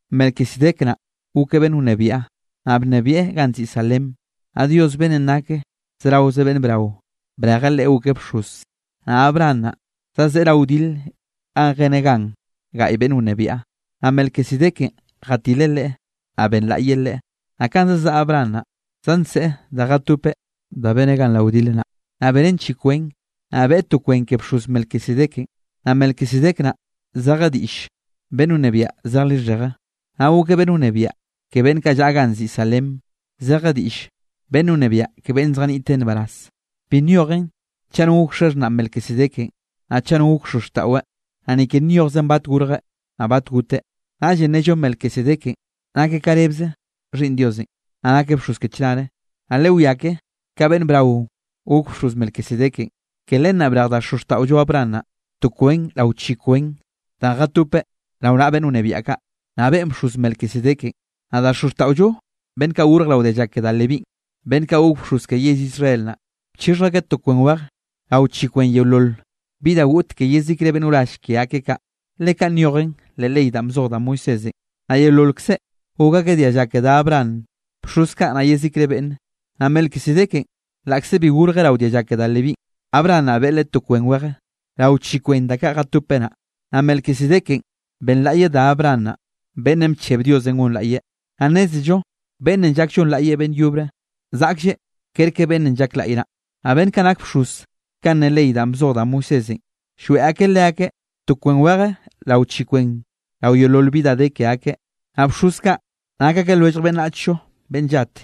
Melquisedec naꞌ gokeꞌ beꞌnn wnebiaꞌ, naꞌ bnebieꞌ ganꞌ nziꞌi Salem, naꞌ Dios beꞌnnenꞌ nake zeraoze beꞌnn brao, brejeꞌ leꞌe gokeꞌ bxoz. Naꞌ Abraham naꞌ zazeꞌe rao wdile ganꞌ jeneꞌ gan gaꞌy beꞌnn wnebiaꞌ, naꞌ Melquisedekenꞌ jatileꞌ leꞌe, naꞌ benlaꞌyeꞌ leꞌe. Naꞌ kanꞌ zazaꞌa Abraham naꞌ, zanseꞌe da jatopeꞌ da beneꞌ gan rao wdil naꞌ, naꞌ beneꞌn chi kwen, naꞌ beꞌe to kwen ke bxoz Melquisedekenꞌ. Naꞌ Melquisedec naꞌ zeje diꞌll “beꞌnn wnebiaꞌ zej lixheje”. Naꞌ gokeꞌ beꞌnn wnebiaꞌ ke beꞌnn kaꞌ llaꞌa ganꞌ nziꞌi Salem, zeje diꞌllenꞌ “beꞌnn wnebiaꞌ ke beꞌnn zjaniꞌte nbaraz”. Bi nyojen chaꞌ no gok xaxhnaꞌ Melquisedekenꞌ, naꞌ chaꞌ no gok xozxtaꞌweꞌ, naꞌ ni ke nyojzen bat gorjeꞌ naꞌ bat goteꞌ. Naꞌllenꞌ nello Melquisedekenꞌ nakeꞌ ka rebze Xhiꞌnn Diosenꞌ, naꞌ nakeꞌ bxoz ke chnare. Naꞌ lewiá ke ka beꞌnn braonꞌ gok bxoz Melquisedekenꞌ. Ke len naꞌ brej da xozxtaꞌollo Abraham naꞌ, to kwen rao chi kwen danꞌ jatopeꞌ rao naꞌa beꞌnn wnebiaꞌ kaꞌ, naꞌ beꞌen bxoz Melquisedekenꞌ. Naꞌ da xozxtaꞌollo beꞌnn kaꞌ gorje rao dialla ke da Levínꞌ, beꞌnn kaꞌ gok bxoz ke yell Israel naꞌ, bchixhj akeꞌ to kwen weje rao chi kwen yeolol bi da goꞌt ke yezikre beꞌnn wrall ke akeꞌ kaꞌ, le kaꞌn nyojen leꞌ ley danꞌ bzoj da Moisésenꞌ. Naꞌ yeololkze gok akeꞌ dialla ke da Abraham, bxoz kaꞌ naꞌ yezikre beꞌnne. Naꞌ Melquisedekenꞌ laꞌkze bi gorjeꞌ rao dialla ke da Levínꞌ, Abraham naꞌ beꞌe leꞌe to kwen weje, rao chi kwen da kaꞌ jatopeꞌ naꞌ, naꞌ Melquisedekenꞌ benlaꞌyeꞌ da Abraham naꞌ, beꞌnnenꞌ bcheb Diosenꞌ gonlaꞌyeꞌ. Naꞌ nnézello beꞌnnenꞌ llak llonlaꞌyeꞌ beꞌnn yobre, zaꞌklleꞌ kerke beꞌnnenꞌ llak laꞌy naꞌ. Naꞌ beꞌnn kaꞌ nak bxoz kanꞌ ne ley danꞌ bzoj da Moisésenꞌ, lloeꞌ akeꞌ leakeꞌ to kwen weje rao chi kwen rao yeolol bi da de ke akeꞌ, naꞌ bxoz kaꞌ nak akeꞌ lwellj beꞌnnachllo beꞌnn llat.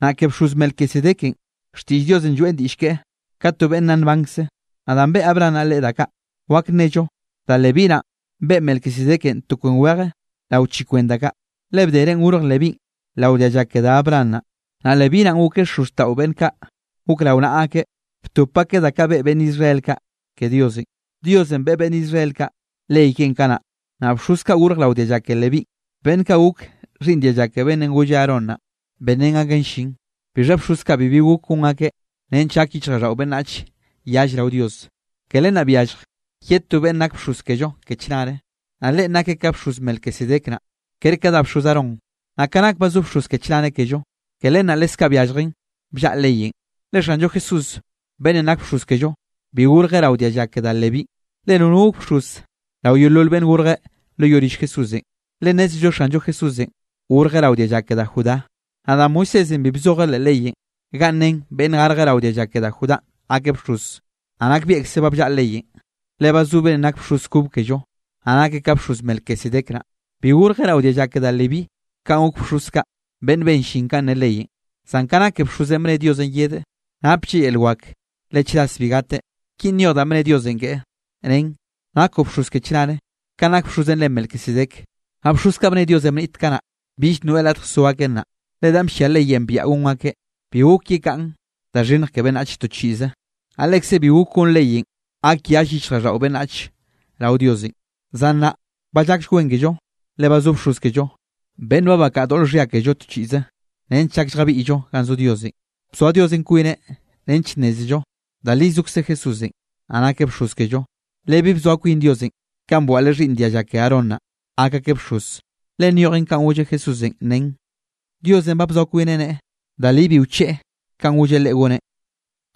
Naꞌ ke bxoz Melquisedekenꞌ, xtiꞌll Diosenꞌ lloeꞌn diꞌll keꞌe ka to beꞌnn nna nbankzeꞌ. Naꞌ danꞌ beꞌe Abraham naꞌ leꞌe da kaꞌ, wak nnello da Leví naꞌn beꞌe Melquisedekenꞌ to kwen weje rao chi kwen da kaꞌ. Le bderenꞌ gorj Levínꞌ rao dialla ke da Abraham naꞌ, naꞌ Leví naꞌn gokeꞌ xozxtaꞌo beꞌnn kaꞌ gok rao naꞌa akeꞌ, btop akeꞌ da kaꞌ beꞌe beꞌnn Israel kaꞌ ke Diosenꞌ. Diosenꞌ beꞌe beꞌnn Israel kaꞌ ley keꞌen kanaꞌ, naꞌ bxoz kaꞌ gorj rao dialla ke Leví, beꞌnn kaꞌ gok xhiꞌnn dialla ke beꞌnnenꞌ golle Aarón naꞌ, benrén akeꞌn llin. Bixha bxoz kaꞌ bibi gok gon akeꞌ nench gak yichjraꞌlldaꞌo beꞌnnachenꞌ yall rao Dios. Ke len naꞌ byallj yed ye to beꞌnn nak bxoz kello ke chnare, naꞌ Leꞌen nakeꞌ ka bxoz Melquisedec naꞌ, kere ka da bxoz Aarón. Naꞌ ka nak ba zo bxoz ke chnare kello, ke len naꞌ leskaꞌ byalljen bllaꞌa leyenꞌ. Le Xanllo Jesúsenꞌ beꞌnnenꞌ nak bxoz kello, bi gorjeꞌ rao dialla ke da Levínꞌ, le nono gok bxoz rao yeolol beꞌnn gorje lo yoꞌ rill Jesúsenꞌ. Le nnézello Xanllo Jesúsenꞌ gorjeꞌ rao dialla ke da Judá, naꞌ da Moisésenꞌ bi bzojeꞌ leꞌ leyenꞌ ganꞌ nen beꞌnn garje rao dialla ke da Judánꞌ gakeꞌ bxoz. Naꞌ nakbieꞌkze ba bllaꞌa leyenꞌ, le ba zo beꞌnnenꞌ nak bxoz kob kello, naꞌ nakeꞌ ka bxoz Melquisedec naꞌ. Bi gorjeꞌ rao dialla ke da Leví kanꞌ gok bxoz kaꞌ, beꞌnn ben llin kanꞌ ne leyenꞌ, zan ka nake bxozenꞌ bne Diosenꞌ yedeꞌ, naplleꞌ yel wak le chras bi gateꞌ. Kinꞌ nyoj danꞌ bne Diosenꞌ keꞌe, nen: Nakoꞌ bxoz ke chnare, kanꞌ nak bxozenꞌ re Melquisedec. Naꞌ bxoz kaꞌ bne Diosenꞌ bniꞌt kanaꞌ, bill noeꞌ latj so akeꞌ nnaꞌ, le danꞌ bllia leyenꞌ biaꞌa gon akeꞌ, bi gok yekaꞌn da xhinnj ke beꞌnnach to chiꞌze. Naꞌ lekze bi gok gon leyenꞌ gak yall yichjraꞌlldaꞌo beꞌnnach rao Diosenꞌ. Zan nnaꞌ ba llakll wen kello, le ba zo bxoz kello, beꞌnn ba bakaꞌa doꞌl xhia kello to chiꞌze, nench llak lljabiꞌyllo ganꞌ zo Diosenꞌ. Bzoa Diosenꞌ kwineꞌ nench nnézello da li zokze Jesúsenꞌ, naꞌ nakeꞌ bxoz kello. Le bi bzoa kwin Diosenꞌ kanꞌ bwaꞌleꞌ xhiꞌnn dialla ke Aarón naꞌ, gak akeꞌ bxoz. Le nyojen kanꞌ golleꞌ Jesúsenꞌ nen: Diosenꞌ ba bzoa kwineꞌ nneꞌe da li bi wcheꞌe kanꞌ golleꞌ Leꞌe goneꞌ: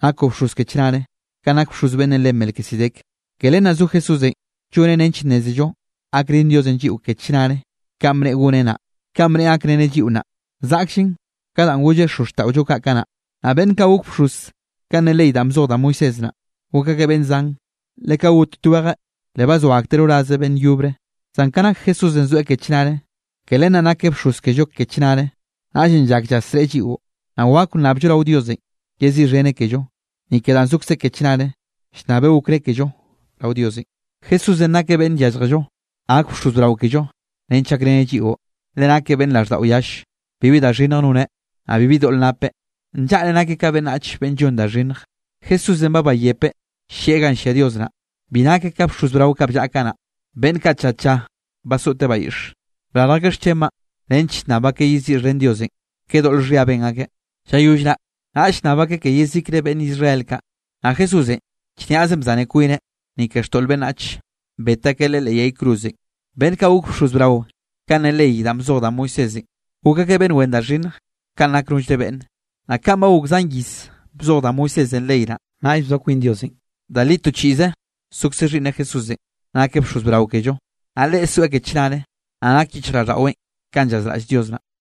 “Nakoꞌ bxoz ke chnare, kanꞌ nak bxoz beꞌnnenꞌ re Melquisedec.” Ke len naꞌ zo Jesúsenꞌ lloneꞌ nench nnézello gakrén Diosenꞌ lliꞌo ke chnare kanꞌ bneꞌe goneꞌ naꞌ. Kanꞌ bneꞌe gakreneꞌ lliꞌo nnaꞌ, zaꞌkllen ka danꞌ golleꞌ xozxtaꞌollo kaꞌ kanaꞌ. Naꞌ beꞌnn kaꞌ gok bxoz kanꞌ ne ley danꞌ bzoj da Moisés naꞌ, gok akeꞌ beꞌnn zan, le ka got twejeꞌ, le bazoa akteꞌ rorazeꞌ beꞌnn yobre. Zan ka nak Jesúsenꞌ zoeꞌ ke chnare, ke len naꞌ nakeꞌ bxoz kello ke chnare. Naꞌllenꞌ llak llasreꞌe lliꞌo, naꞌ wak nnabllo rao Diosenꞌ yeziꞌxheneꞌ kello, ni ke danꞌ zokzeꞌ ke chnare llnnabeꞌ okré kello rao Diosenꞌ. Jesúsenꞌ nakeꞌ beꞌnn yálljello, gak bxoz brao kello nench gakreneꞌ lliꞌo, le nakeꞌ beꞌnn raꞌlldaꞌo yall. Bibi da xhinnj noneꞌ, naꞌ bibi doꞌl napeꞌ. Nllaꞌre nakeꞌ ka beꞌnnach beꞌnn llon da xhinnj. Jesúsenꞌ ba bayepeꞌ llieꞌ ganꞌ llia Dios naꞌ. Bi nakeꞌ ka bxoz brao kaꞌ bllaꞌa kanaꞌ, beꞌnn kaꞌ tlla tlla basoꞌte bayiꞌx, brarj akeꞌ xchenbaꞌ nench llnnab akeꞌ yeziꞌxhen Diosenꞌ ke doꞌl xhia ben akeꞌ. Llayoll naꞌ naꞌll llnnab akeꞌ ke yezikre beꞌnn Israel kaꞌ. Naꞌ Jesúsenꞌ chniaze bzane kwineꞌ, ni ke xtoꞌl beꞌnnach, bet akeꞌ Leꞌe leꞌ yay cruzenꞌ. Beꞌnn kaꞌ gok bxoz brao kanꞌ ne ley danꞌ bzoj da Moisésenꞌ, gok akeꞌ beꞌnn wen da xhinnj kanꞌ nak nollre beꞌnne. Naꞌ kanꞌ ba gok zan iz bzoj da Moisésenꞌ ley naꞌ, naꞌll bzoa kwin Diosenꞌ da li to chiꞌze zokze Xhiꞌnneꞌ Jesúsenꞌ, nakeꞌ bxoz brao kello. Naꞌ Leꞌe zoeꞌ ke chnare, naꞌ nak yichjraꞌlldaꞌweꞌn kanꞌ llazraꞌll Dios naꞌ.